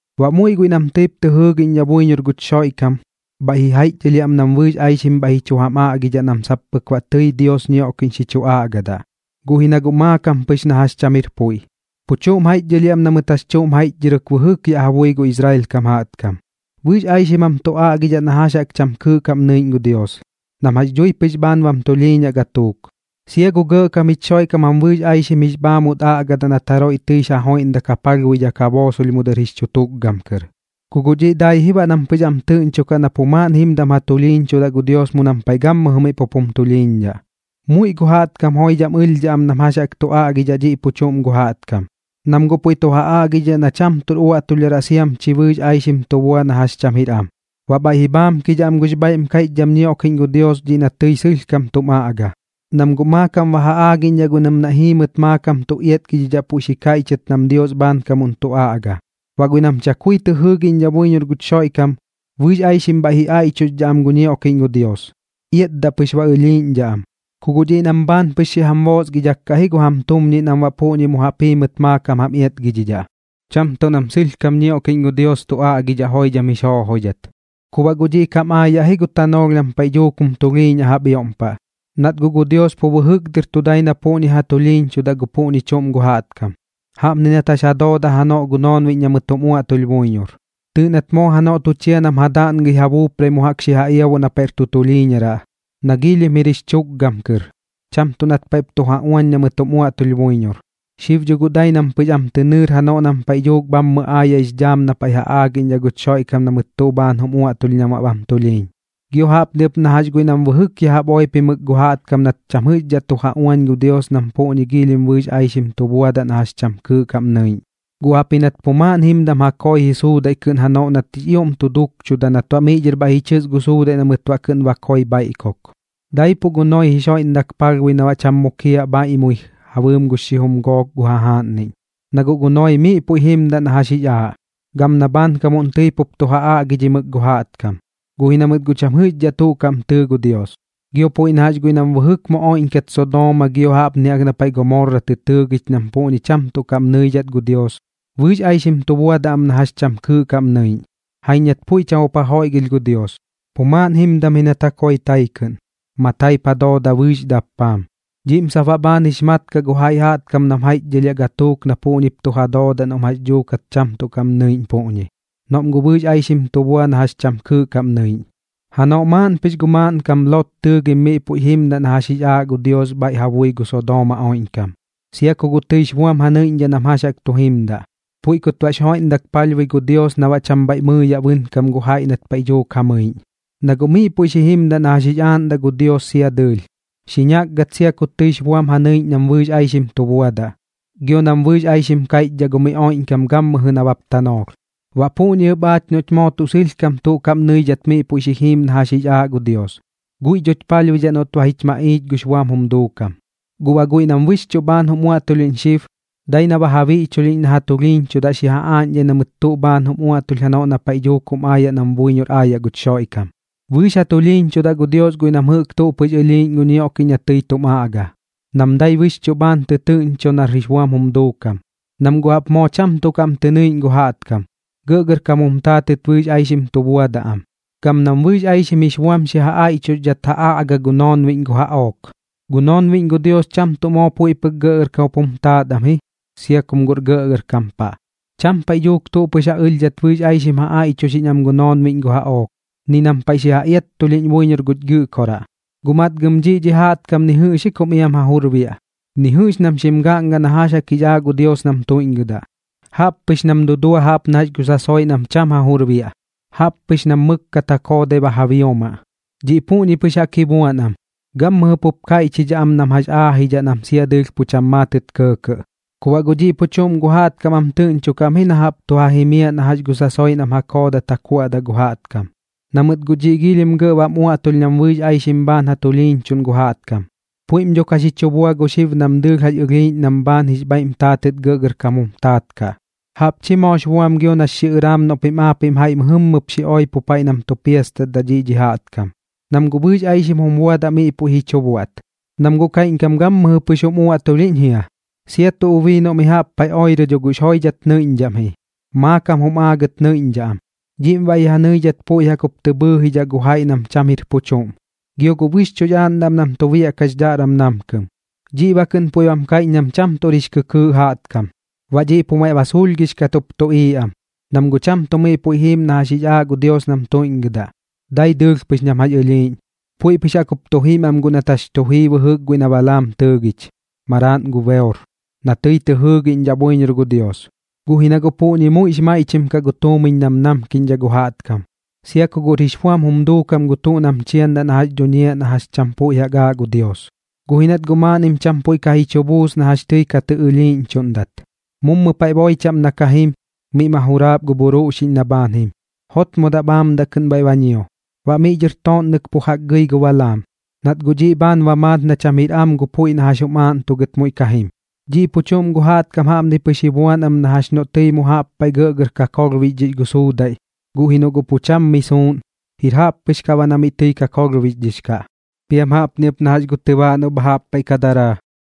Baꞌ muiꞌ guiꞌ nam tɨip tɨ jɨɨgiꞌñdhaꞌ buiñor guch Xoiꞌkam bhaiꞌ ji jaiꞌchdhɨlhiaꞌ am nam bɨɨx aixim bhaiꞌ ji chu jam aꞌgidhaꞌ nam sap pɨk baꞌ tɨi Dios ñioꞌkiꞌñ xi chu aꞌgadaꞌ, guꞌ ji na guꞌ maakam pɨx na jax cham jir puiꞌ. Pu chuꞌm jaiꞌchdhɨlhiaꞌ am na mɨt jax chuꞌm jaiꞌchdhɨrɨk bɨjɨk yaꞌ ja bui gu Israel kam jaꞌtkam. Bɨɨx aixim jam tu aꞌgidhaꞌ na jax jaꞌk cham kɨɨꞌ kaꞌm nɨiꞌñ gu Dios, nam jax dhui pɨx bhaan bam tulhiiñaꞌ gatuuk. Sia gu Gɇꞌkam jich Xoiꞌkam jam bɨɨx aixim jix bhaamut aꞌgadaꞌ nat jaroiꞌ tɨix ja joiꞌndak ja palhbuidhak ja boosolh mu dɨr jix chu tukgam kɨr. Ku guꞌ dhiꞌ dai ji baꞌ nam pɨx am tɨꞌñchokaꞌ na pu maaꞌn jimdam ja tulhiiñchudaꞌ gu Dios mu nam paiꞌ gammɨjɨ miꞌ pup jum tulhiiñdhaꞌ. Muiꞌ gu jaꞌtkam joidham ɨlhdhaꞌ am nam jax jaꞌk tu aꞌgidhaꞌ dhiꞌ pu chuꞌm gu jaꞌtkam, nam guꞌ puiꞌ tu ja aꞌgidhidhaꞌ na cham tuꞌr uaꞌtulhdharaꞌ kaꞌ siam chi bɨɨx aixim tu bua na jax cham jir am. Baꞌ bhaiꞌ ji bhaamkidhaꞌ am gux bhaiꞌm kaiꞌchdham ñioꞌkiꞌñ gu Dios dhiꞌ na tɨi sɨlhkam tum aꞌga, nam guꞌ maakam ba ja aagiꞌñdhaꞌ guiꞌ nam naiꞌ jiimɨt maakam tu iatgidhidhaꞌ puiꞌ xi kaiꞌchɨt nam Dios bhaankamuꞌn tu aꞌgadaꞌ. Baꞌ guiꞌ nam chakui tɨ jɨɨgiꞌñdhaꞌ buiñor guch Xoiꞌkam, bɨɨx aixim bhaiꞌp ji aiꞌchuxdhaꞌ am gu ñioꞌkiꞌñ gu Dios, iatdaꞌ pɨx ba ɨlhiiꞌñdhaꞌ am. Ku guꞌ dhiꞌ nam bhaan pɨx xi jam boosgidhak kaꞌ ji gu jam tumñiꞌ nam baꞌ puꞌñi mu jaꞌp jiimɨt maakam jam iatgidhidhaꞌ, cham tuꞌ nam sɨlhkam ñioꞌkiꞌñ gu Dios tu aꞌgidhaꞌ joidham jix joojoidhat. Ku baꞌ guꞌ dhiꞌ kam aayaꞌ ji gu tanoolh nam paiꞌ dhuuk jum tulhiiñaꞌ jaꞌp ioꞌm paꞌ, nat guꞌ gu Dios pu bɨjɨk dɨr tu dai na puꞌñi ja tulhiiñchudaꞌ gu puꞌñi chuꞌm gu jaꞌtkam. Jaꞌpni nat jax ja doodaꞌ janoꞌ gu noonbiꞌñ na mɨt jum uaꞌtulh buiñor. Tɨɨꞌ nat moo janoꞌ tu chia nam ja daꞌngɨi ja buuprai mu jaꞌk xi ja iabuꞌ na paiꞌr tu tulhiiñaraꞌ, na giilhim jir jix chukgam kɨr, cham tuꞌ nat paiꞌp tu ja uañ na mɨt jum uaꞌtulh buiñor. Xib dho guꞌ dai nam pɨx am tɨ nɨɨr janoꞌ nam paiꞌ dhuuk bhammɨ aayaꞌx dhaam na paiꞌ ja aagiꞌñdhaꞌ guch Xoiꞌkam na mɨt tuꞌ bhaan jum uaꞌtulh nam baꞌ bam tulhiiñ. Gio jaꞌpni ɨp na jax guiꞌ nam bɨjɨk yaꞌ oipimɨk gu jaꞌtkam nat cham jɨꞌxdhat tu ja uañ gu Dios nam puꞌñi giilhim bɨɨx aixim jix buam tu buadaꞌ na jax cham kɨɨꞌ kaꞌm nɨiꞌñ, guꞌ jaꞌpji nat pu maaꞌn jimdam ja koi ji suudaiꞌ kɨꞌn janoꞌ nat jix ioꞌm tu duukchuda nat baꞌ miꞌ dhɨr bhaiꞌ ji chɨs gu suudaiꞌ na mɨt baꞌ kɨꞌn ba koi bhaiꞌkuk. Daipuꞌ gu Noee jix joiꞌndak palhbui na cham mukiaꞌ bhaiꞌmui ja bɨɨm gux xijum gook gu jajaaꞌnniꞌñ. Na guꞌ gu Noee miꞌ puiꞌ jimdaꞌ na jax jix aaꞌ, gam na bhaankamuꞌn tɨi pup tu ja aꞌgidhimɨk gu jaꞌtkam, guꞌ ji na mɨt guꞌ cham jɨꞌxdhaꞌ tuꞌ kaꞌm tɨɨ gu Dios. Gio puiꞌ na jax guiꞌ nam bɨjɨk mu oiꞌñkat Sodooma gio jaꞌpni jaꞌk na paiꞌ Gomorra tɨ tɨɨgich nam puꞌñi cham tuꞌ kaꞌm nɨidhat gu Dios, bɨɨx aixim tu buadaꞌ am na jax cham kɨɨꞌ kaꞌm nɨiꞌñ. Jaiñ nat puiꞌ cham jup ja joiꞌgɨlh gu Dios, pu maaꞌn jimdam ji nat ja koi tai kɨꞌn, mataip ja dooda bɨɨx dappaam. Dhiꞌm sap baꞌ bhaan jix mat kaꞌ gu jaiꞌ jaꞌtkam nam jaiꞌchdhɨlhiaꞌ gatuuk na puꞌñip tu ja doodaꞌ noꞌm jax dhuukat cham tuꞌ kaꞌm nɨiꞌñ puꞌñi, noꞌm guꞌ bɨɨx aixim tu bua na jax cham kɨɨꞌ kaꞌm nɨiꞌñ. Janoꞌ maaꞌn pɨx gu maaꞌnkam Lot tɨɨgim miꞌ puiꞌ jimdaꞌ na jax jix aaꞌ gu Dios bhaiꞌ ja bui gu Sodooma oiꞌñkam, sia ku guꞌ tɨix buam ja nɨiꞌñdhaꞌ nam jax jaꞌk tu jimdaꞌ. Puiꞌ kut baꞌx joiꞌmdak palhbui gu Dios na baꞌ cham bhaiꞌ mɨɨyaꞌ bɨnkam gu jaiꞌ nat paiꞌ dhuuk ja mɨiꞌñ. Na guꞌ miꞌ puiꞌ xi jimdaꞌ na jax jix aaꞌndaꞌ gu Dios sia dɨɨlh, xi ñakgat sia ku tɨix buam ja nɨiꞌñ nam bɨɨx aixim tu buadaꞌ, gio nam bɨɨx aixim kaiꞌchdhaꞌ gu miꞌ oiꞌñkam gammɨjɨ nabap tanoolh. Baꞌ puꞌñi ɨp aach noꞌch moo tuꞌ sɨlhkam tuꞌ kaꞌm nɨidhat miꞌ puiꞌ xi jiim na jax jix aaꞌ gu Dios, guiꞌ dhoch palhbuidhaꞌ noꞌt ba jich maꞌiich gux buam jum duukam. Guꞌ baꞌ guiꞌ nam bɨxchuꞌ bhaan jum uaꞌtulhiꞌñ xib, dai na ba ja biꞌchulhiꞌñ na ja tulhiiñchudaꞌ xi ja aaꞌñdhai na mɨt tuꞌ bhaan jum uaꞌtulh janoꞌ na paiꞌ dhuuk jum aayaꞌ nam buiñor aayaꞌ guch Xoiꞌkam. Bɨɨx ja tulhiiñchudaꞌ gu Dios guiꞌ nam tuꞌ pɨx ɨlhiiꞌñ gu ñioꞌkiꞌñ na tɨi tum aꞌga, nam dai bɨxchuꞌ bhaan tɨtɨɨꞌñcho nar jix buam jum duukam, nam guꞌ jaꞌp moo cham tuꞌ kaꞌm tɨ nɨiꞌñ gu jaꞌtkam, gɇꞌgɇrkam jum taatɨt bɨɨx aixim tu buadaꞌ am, gam nam bɨɨx aixim jix buam xi ja aiꞌchuxdhat ja aꞌga gu noonbiꞌñ gu jaꞌook. Gu noonbiꞌñ gu Dios cham tuꞌ moo puiꞌ pɨk gɇꞌgɇrkam jup jum taat am, sia kum guꞌr gɇꞌgɇrkam paꞌ, cham paiꞌ dhuuk tuꞌ pɨx ja ɨlhdhat bɨɨx aixim ja aiꞌchuxiꞌñ am gu noonbiꞌñ gu jaꞌook, ni nam paiꞌ xi ja iattulhiꞌñ buiñor guch Gɨꞌkoraꞌ. Guꞌ matgam dhiꞌ dhi jaꞌtkam ni jɨꞌx ji kum iam ja jur biaꞌ, ni jɨꞌx nam xim gaꞌnga na jax jaꞌk jix aaꞌ gu Dios nam tuiꞌñgɨdaꞌ. Jaꞌp pɨx nam dudua jaꞌp na jax gu sasoiꞌ nam pu cham ja jur biaꞌ, jaꞌp pɨx nam mɨkkat ja koodai ba ja biomaꞌ. Dhiꞌ puꞌñi jaꞌk pɨx ji buan am, gammɨjɨ pup kaiꞌchidhaꞌ am nam jax aajidhaꞌ nam sia dɨɨlh pu cham maatɨt kɇɇkɇꞌ. Ku baꞌ guꞌ dhiꞌ pu chuꞌm gu jaꞌtkam am tɨꞌñchokaꞌ am ji na jaꞌp tu ja jimiaꞌ na jax gu sasoiꞌ nam ja koodat ja kuaꞌdaꞌ gu jaꞌtkam. Na mɨt guꞌ dhiꞌ giilhim gɇꞌ bam uaꞌtulh nam bɨɨx aixim bhaan ja tulhiiñchuꞌn gu jaꞌtkam. Puiꞌm dho ka xi chu bua xib nam dɨɨlh jax ɨlhiiꞌñ nam bhaan jix bhaiꞌm taatɨt gɇꞌgɇrkam jum taat kaꞌ. Jaꞌp chi moox buam gio nax xiꞌɨraam noꞌ pim aapiꞌm jaiꞌ mɨjɨmmɨp xi oipo paiꞌ nam tu piastatdaꞌ dhiꞌ dhi jaꞌtkam, nam guꞌ bɨɨx aixim jum buadaꞌ miꞌ puiꞌ ji chu buaꞌt. Nam guꞌ kaiꞌñkam gammɨjɨ pɨx jum uaꞌtulhiꞌñ jia. Sia tuꞌ ubii noꞌ mi jaꞌp paiꞌ oirɨ dho guꞌx joidhat nɨiꞌñdhaꞌ am ji, maakam jum aagɨt nɨiꞌñdhaꞌ am. Dhiꞌm baꞌ ji ja nɨidhat puiꞌ jaꞌk jup tɨ bhɨɨjidhaꞌ gu jaiꞌ nam cham jir pu chuꞌm, gio guꞌ bɨxchuꞌx aaꞌndaꞌ am nam tu biaꞌkaꞌ jix dhaꞌram namkɨm. Dhiꞌ baꞌ kɨꞌn puiꞌ bam kaiꞌch nam cham tuꞌr jix kɨkɨɨꞌ jaꞌtkam. Baꞌ dhiꞌ pu maiꞌ ba suulhgix kat jup tuꞌiiꞌ am, nam guꞌ cham tuꞌ miꞌ puiꞌ jiim na jax jaꞌk jix aaꞌ gu Dios nam tuiꞌñgɨdaꞌ, dai dɨɨlh pɨx nam jax ɨlhiiꞌñ. Puiꞌ pɨx jaꞌk jup tu jim am guꞌ nat jax tu jii bɨjɨk guiꞌ na Balaam tɨɨgich, maraaꞌn gu Beor, na tɨi tɨ jɨɨgiꞌñdhaꞌ buiñor gu Dios, guꞌ ji na guꞌ puꞌñi muiꞌx maiꞌchim kaꞌ gu tuumiñ nam namkiꞌñdhaꞌ gu jaꞌtkam, sia ku guꞌr jix buam jum duukam gu tuꞌ nam chiandaꞌ na jax dhuñiaꞌ na jax cham puiꞌ jaꞌk aaꞌ gu Dios. Guꞌ ji nat guꞌ maaꞌnnim cham puiꞌ ka ji chu buus na jax tɨi ka tɨ ɨlhiiꞌñchuꞌndat. Mummu paiꞌ boi chaꞌm na ka jim, miꞌ ma juraap gu bhuruꞌxiꞌñ na bhaan jim. Jotmodaꞌ bhaamdaꞌ kɨꞌn bhaiꞌ ba ñio, baꞌ miꞌ dhɨr tooꞌnnɨk pu jaꞌk gɨi gu Balaam, nat guꞌ dhiꞌ bhaan ba maat na cham jir am gu puiꞌ na jax jum aaꞌntugɨt muiꞌ ka jim. Dhiꞌ pu chuꞌm gu jaꞌtkam jaꞌpni pɨx ji buan am na jax noꞌ tɨi mu jaꞌp paiꞌ gɇꞌgɇr kakolhbixdhix gu suudaiꞌ, guꞌ ji noꞌ guꞌ pu cham mi suuꞌn, jir jaꞌp pɨx kaꞌ baꞌ na mi kakolhbixdhix kaꞌ. Piam jaꞌpni ɨp na jax gu tɨbaaꞌ noꞌ bha jaꞌp paiꞌ ka daraa,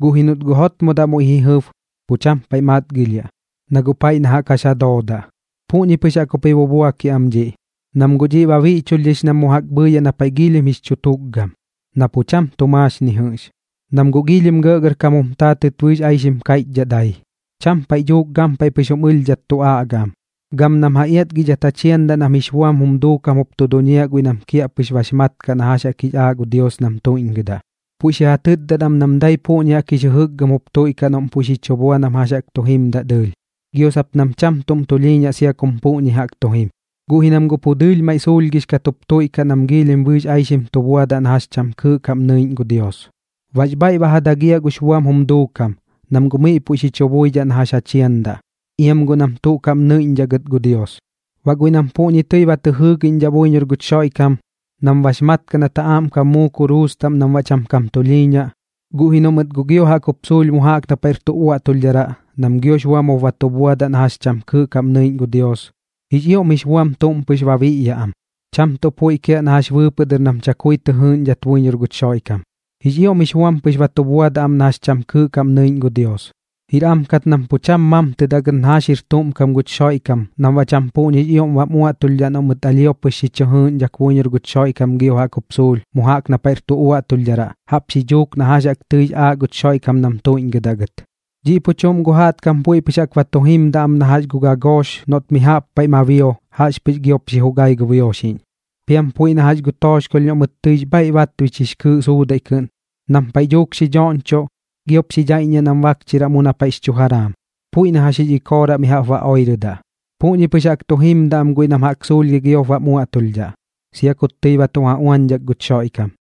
guꞌ ji noꞌt guꞌ jotmodaꞌ muiꞌ ji jɨb, pu cham paiꞌ matgilhiaꞌ, na guꞌ paiꞌ na jaꞌk jax ja doodaꞌ. Puꞌñi pɨx jaꞌk jup ji bubuakiaꞌ am dhiꞌ, nam guꞌ dhiꞌ ba biꞌchulhdhix nam mu jaꞌk bhɨɨyaꞌ na paiꞌ giilhim jix chu tukgam, na pu cham tu maax ni jɨꞌx. Nam guꞌ giilhim gɇꞌgɇrkam jum taatɨt bɨɨx aixim kaiꞌchdhaꞌ dai, cham paiꞌ dhuuk gampaiꞌ pɨx jum ɨlhdhat tu aꞌgaꞌ am. Gam nam ja iatgidhat ja chiandaꞌ nam jix buam jum duukam jup tu duñiaꞌ guiꞌ nam kiaꞌpɨx bax mat kaꞌ na jax jaꞌk jix aaꞌ gu Dios nam tuiꞌñgɨdaꞌ. Puiꞌ xi ja tɨtdat am nam dai puꞌñi jaꞌk jix jɨjɨkgɨm jup tuiꞌkaꞌ noꞌm puiꞌ xi chu bua nam jax jaꞌk tu jimdaꞌ dɨɨlh, gio sap nam cham tuꞌm tulhiiñaꞌ sia kum puꞌñi jaꞌk tu jim. Guꞌ ji nam guꞌ pu dɨɨlh maiꞌ suulhgix kat jup tuiꞌkaꞌ nam giilhim bɨɨx aixim tu buadaꞌ na jax cham kɨɨꞌ kaꞌm nɨiꞌñ gu Dios. Bax bhaiꞌ ba ja dagiaꞌ gux buam jum duukam, nam guꞌ miꞌ puiꞌ xi chu buidhaꞌ na jax ja chiandaꞌ. Iam guꞌ nam tuꞌ kaꞌm nɨiꞌñdhaꞌ gɨt gu Dios. Baꞌ guiꞌ nam puꞌñi tɨi ba tɨ jɨɨgiꞌñdhaꞌ buiñor guch Xoiꞌkam, nam bax mat kaꞌ nat ja aꞌmkam muu kuruus taꞌm nam baꞌ cham kam tulhiiñaꞌ, guꞌ ji noꞌ mɨt guꞌ gio jaꞌk jup suulh mu jaꞌk na paiꞌr tu uaꞌtulhdharaꞌ nam giox buam jup ba tu buadaꞌ na jax cham kɨɨꞌ kaꞌm nɨiꞌñ gu Dios, jix ioꞌm jix buam tuꞌm pɨx ba biꞌyaꞌ am, cham tuꞌ puiꞌ kiaꞌ na jax bɨɨpɨꞌ dɨr nam chakui tɨ jɨɨꞌñdhat buiñor guch Xoiꞌkam. Jix ioꞌm jix buam pɨx ba tu buadaꞌ am na jax cham kɨɨꞌ kaꞌm nɨiꞌñ gu Dios. Jir am kat nam pu cham mamtɨdaꞌ gɨt na jax jir tuꞌm kam guch Xoiꞌkam nam baꞌ cham puꞌñix ioꞌm bam uaꞌtulhdhaꞌ noꞌ mɨt alhio pɨx xi chɨ jɨɨꞌñdhak buiñor guch Xoiꞌkam gio jaꞌk jup suulh mu jaꞌk na paiꞌr tu uaꞌtulhdharaꞌ jaꞌp xi dhuuk na jax jaꞌk tɨix aaꞌ guch Xoiꞌkam nam tuiꞌñgɨdaꞌ gɨt. Dhiꞌ pu chuꞌm gu jaꞌtkam puiꞌ pɨx jaꞌk ba tu jimdaꞌ am na jax gu gagoox noꞌt mi jaꞌp paiꞌ ma bio, jaꞌxpɨx giop xi jugai gu bioxiꞌñ. Piam puiꞌ na jax gu tooxkolh noꞌ mɨt tɨix bhaiꞌ batbich jix kɨɨꞌ suudaiꞌ kɨꞌn, nam paiꞌ dhuuk xi dhoꞌñchoꞌ, giop xi dhaiꞌññiaꞌ nam bakchiraꞌ mu na paiꞌx chu jaraam, puiꞌ na jax jix ikooraꞌ mi jaꞌp ba oirɨdaꞌ. Puꞌñi pɨx jaꞌk tu jimdaꞌ am guiꞌ nam jaꞌk suulhgɨi giop bam uaꞌtulhdhaꞌ, sia kut tɨi ba tu ja uañdhak guch Xoiꞌkam.